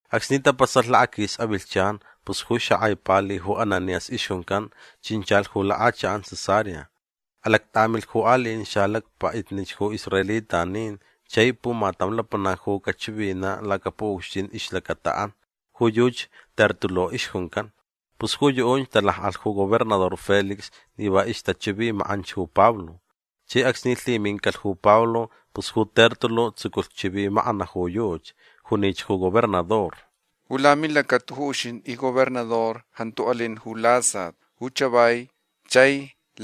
Acsni tapasalh lakaquis avilhchan pus ju xakʼai pali ju Ananías ixjuncan chinchalh ju lakʼachakʼan Cesarea. Alactʼamilh ju aliʼin xalacpaʼitnich ju israelitanin chai pumatam lapanac ju cachivinaʼ lacapuʼucxtin ixlacataʼan. Ju yuchi Tértulo ixjuncan. Pus ju yuʼunch talakʼalh ju gobernador Félix ni va ixtachivimakʼanch ju Pablo. Chai acsni lhimincalh ju Pablo pus ju Tértulo tsuculh chivimakʼanaʼ ju yuchi. Junich ju gobernador: ―Ju lamilacata ju uxintʼi ji gobernador jantu alin ju lasat ju chavai chai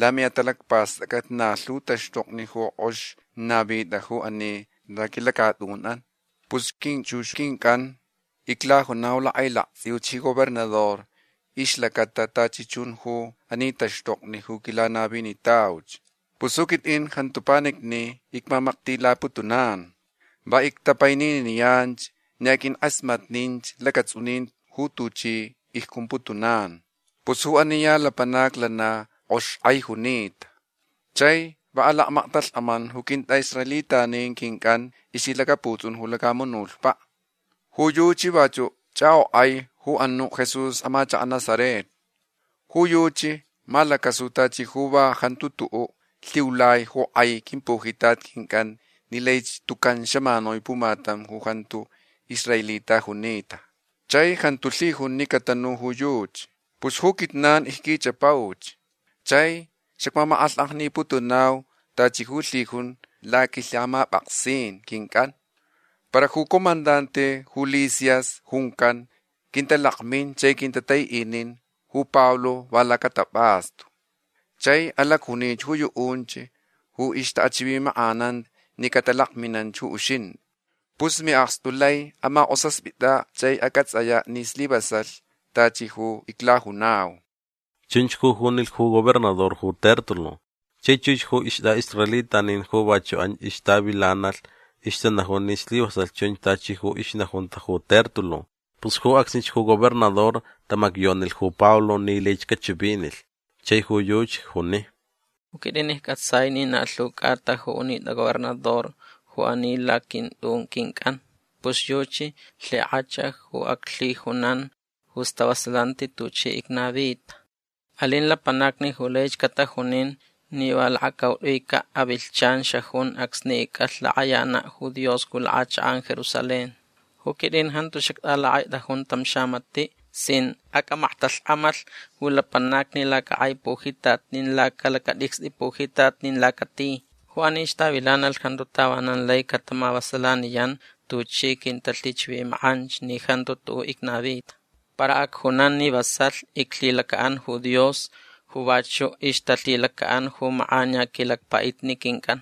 lamiʼatalacpastʼacʼat na lhu taxtokni ju kʼox navitʼa ju ani laquilacatʼunʼan. Pus quinchux quincʼan iclajunau lakʼailaktsʼiuch ji gobernador ixlacata tachi chun ju ani taxtokni ju quilanavinitauch. Pus ju quitʼin jantu panicni icmamaktilaputunan. Va ictapaininiyan ni aqʼuinkʼasmatninch lacatsʼunin ju tuchi icjumputunan. Pus ju ani ya lapanac lana kʼox kʼai junita. Chai va alakmaktalhkʼaman ju quintʼaʼisraelitanin quincʼan ixlhilacaputsʼun ju lacamunutpaʼ. Ju yuchi vachuʼ chʼakʼokʼai ju anuʼ Jesús amachakaʼ Nazaret. Ju yuchi malacasulh tachi ju va jantu tuʼuʼ lhiulai ju kʼai quimpujitat quincʼan ni laich tucan xamanui pumatam ju jantu israelita junita. Chai jantu lhijun ni catanu ju yuchi. Pus ju quijnan icquichʼapauch. Chai xacmamakʼalhkʼajniputunau tachi ju lhijun laquilhamapʼaksin quincʼan. Para ju comandante ju Lisias juncan quintalakmin chai quintataiʼinin ju Pablo va lacatapʼastu. Chai alacjuni ju yuʼunch ju ixtaʼachivimakʼanan ni catalakminanch ju uxintʼi. Pus miʼakstu lai amakʼosaspʼitʼaʼ chai acʼatsʼayaʼ ni slivasalh tachi ju iclajunau. ―Chunch ju junilh ju gobernador ju Tértulo. Chai chux ju istʼaʼisraelitanin ju vachuʼ anch ixtavilanalh ixtanajun ni slivasalh chunch tachi ju ixnajunta ju Tértulo. Pus ju acsnich ju gobernador tamacyonilh ju Pablo ni laich cachivinilh. Chai ju yuchi juni: ―Ju quitʼin iccʼatsai ni na lhu cʼata ju unitʼa gobernador ju ani laquintʼun quincʼan. Pus yuchi lhikʼach ju aclhijunan ju stavasalanti tuchi icnavita. Alin lapanacni ju laich catajunin ni va lakacautʼuicaʼ avilhchan xajun acsni icʼalh lakʼayanaʼ ju Dios ju lakʼachakʼan Jerusalén. Ju quitʼin jantu xactʼalakʼaitʼajun tam xamatiʼ sin acʼamaktalhkʼamalh ju lapanacni lacakʼai pujitat nin lacalacatʼicstʼi pujitat nin lacati. Ju anich tavilanalh jantu tavanan lai catamavasalaniyan tuchi quintalhichivimakʼanch ni jantu tuʼuʼ icnavita. Para acjunan ni vasalh iclhilacaʼan ju Dios ju vachuʼ ixtalhilacaʼan ju makʼaniya quilacpaʼitni quincʼan.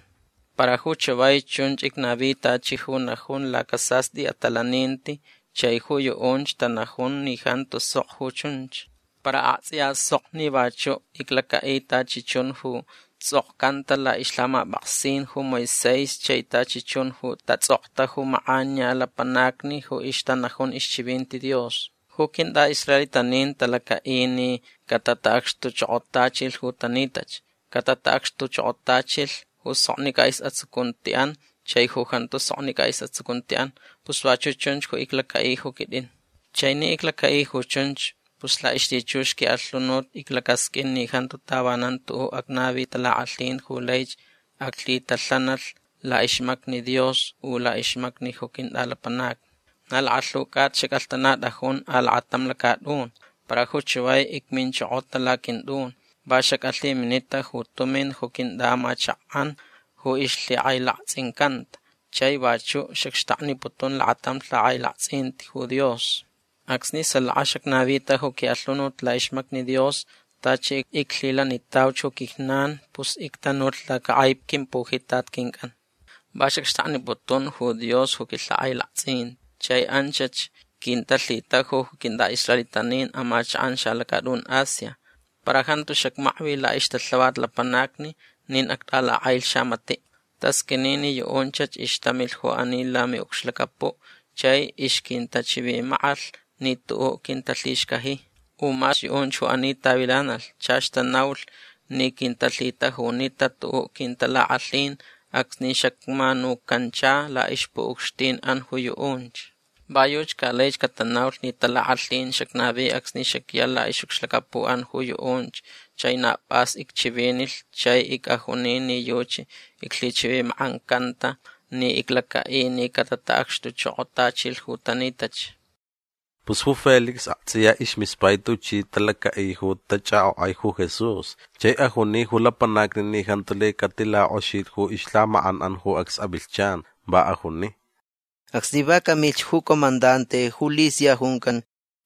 Para ju chavai chunch icnavi tachi ju najun lacasastʼi atalaninti chai ju yuʼunch tanajun ni jantu sok ju chunch. Para aktsʼiya sok ni vachuʼ iclacaʼi tachi chun ju tsʼokcanta laʼixlhamapʼaksin ju Moisés chai tachi chun ju tatsʼokta ju makʼaniya lapanacni ju ixtanajun ixchivinti Dios. Ju quintʼaʼisraelitanin talacaʼi ni catataʼacxtuchokotachilh ju tanitach. Catataʼacxtuchokotachilh ju soknicʼa isʼatsucuntiʼan chai ju jantu soknicʼa isʼatsucuntiʼan. Pus vachuʼ chunch ju iclacaʼi ju quitʼin. Chai ni iclacaʼi ju chunch pus laʼixlhichux quiʼalhunut iclacasqʼuin ni jantu tavanan tuʼuʼ acnavi talakʼalhin ju laich aclhitalhanalh laʼixmacni Dios u laʼixmacni ju quintʼalapanacni. Na lakalhu cʼata xacʼalhtanatʼajun alakatam lacatʼun. Para ju chavai icminchokota laquintʼun. Va xacʼalhiminita ju tumin ju quintʼaʼamachakʼan ju ixlhikʼailaktsʼincanta. Chai vachuʼ xacxtakniputun lakatam lhakʼailaktsʼin ju Dios. Acsni salaka xacnavita ju quiʼalhunut laʼixmacni Dios tachi ju iclhilanitauch ju quijnan pus ictanulh lacakʼai quimpujitat quincʼan. Va xacxtakniputun ju Dios ju quilhakʼailaktsʼin. Chai anchach quintalhitajulh ju quintʼaʼisraelitanin amachakʼan xalacatʼun Asia. Para jantu xacmakvi laʼixtalhavat lapanacni nin actʼalakʼailh xamatiʼ. Tasqʼuini ni yuʼunchach ixtamilh ju ani lamiʼucxlacapuʼ chai ixquintachivimakʼalh ni tuʼuʼ quintalhixcaji. U mas yuʼunch ju ani tavilanalh chach tanaulh ni quintalhitajunita tuʼuʼ quintalakʼalhin acsni xacmanucancha laʼixpuʼucxtinʼan ju yuʼunch. Va yuchi ca laich catanaulh ni talakʼalhin xacnavi acsni xacya laʼixʼucxlacapuʼan ju yuʼunch chai na pʼas icchivinilh chai icʼajuni ni yuchi iclhichivimakʼancanta ni iclacaʼi ni catataʼacxtuchokotachilh ju tanitach. Pus ju Félix aktsʼiya ismispai tuchi talacaʼi ju tachʼakʼokʼai ju Jesús chai ajuni ju lapanacni ni jantu lai catilakʼoxilh ju ixlhamakʼanʼan ju acs avilhchan. Va ajuni: ―Acsni va camilh ju comandante ju Lisias juncan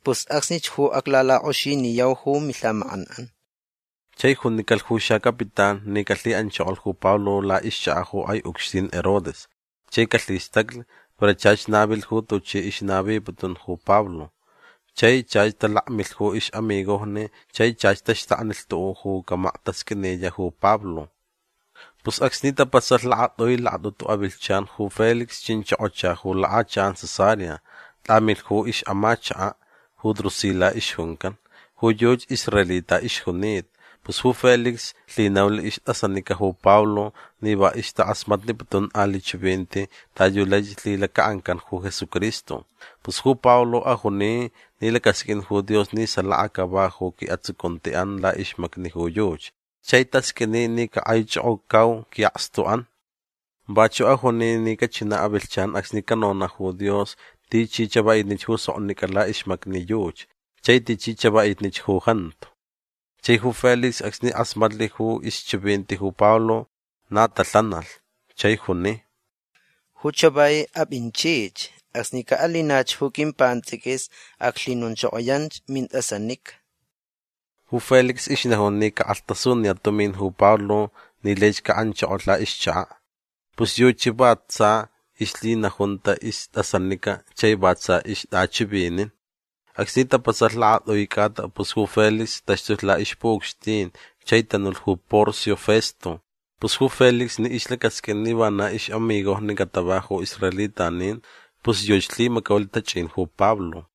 pus acsnich ju aclalakʼoxiniyau ju milhamakʼanʼan. Chai junicalh ju xacapitán ni calhiʼanchokolh ju Pablo laʼixchakaʼ ju kʼai ucxtin Herodes chai calhistaclh para chach navilh va tuchi ixnaviputun ju Pablo. Chai chach talakmilh ju ixʼamigojni chai chach taxtakni tuʼuʼ ju camaktasqʼuiniyaʼ ju Pablo. Pus acsni tapasalh lakatʼui lakatʼutu avilhchan ju Félix chinchokocha ju lakʼachakʼan Cesarea. Tʼamilh ju ixʼamachakaʼ ju Drusila ixjuncan. Ju yuchi israelita ixjunita. Pus ju Félix lhinaulh istʼasanica ju Pablo ni va ixtakʼasmatniputun aliʼ chivinti ta yu lai lhilacaʼancan ju Jesucristo. Pus ju Pablo ajuni ni lacasqʼuin ju Dios ni salaka cava ju quiʼatsucuntiʼan laʼixmacni ju yuchi. Chai tasqʼuini ni cakʼaichokocau quiʼakstuʼan. Vachuʼ ajuni ni cachinaʼ avilhchan acsni canonaʼ ju Dios tichi chavaʼitnich ju soknicʼa laʼixmacni yuchi chai tichi chavaʼitnich ju jantu. Chai ju Félix acsni kʼasmatnilh ju ixchivinti ju Pablo na talhanalh chai juni: ―Ju chavai apʼinchich. Acsni caʼalinach ju quimpantsʼiquis aclhinonchokoyach mintʼasanica. Ju Félix ixnajun ni ca cakʼalhtasuniyaʼ tumin ju Pablo ni laich caʼanchokolh laʼixchakaʼ. Pus yuchi va tsa ixlhilhinajunta istʼasanica chai va tsa ixtʼachivinin. Acsni tapasalh lakatʼui cʼata pus ju Félix taxtulh laʼixpuʼucxtin chai tanulh ju Porcio Festo. Pus ju Félix ni ixlacasqʼuin ni vana ixʼamigojni catava ju israelitanin pus yuchi lhimacaulh tachʼin ju Pablo.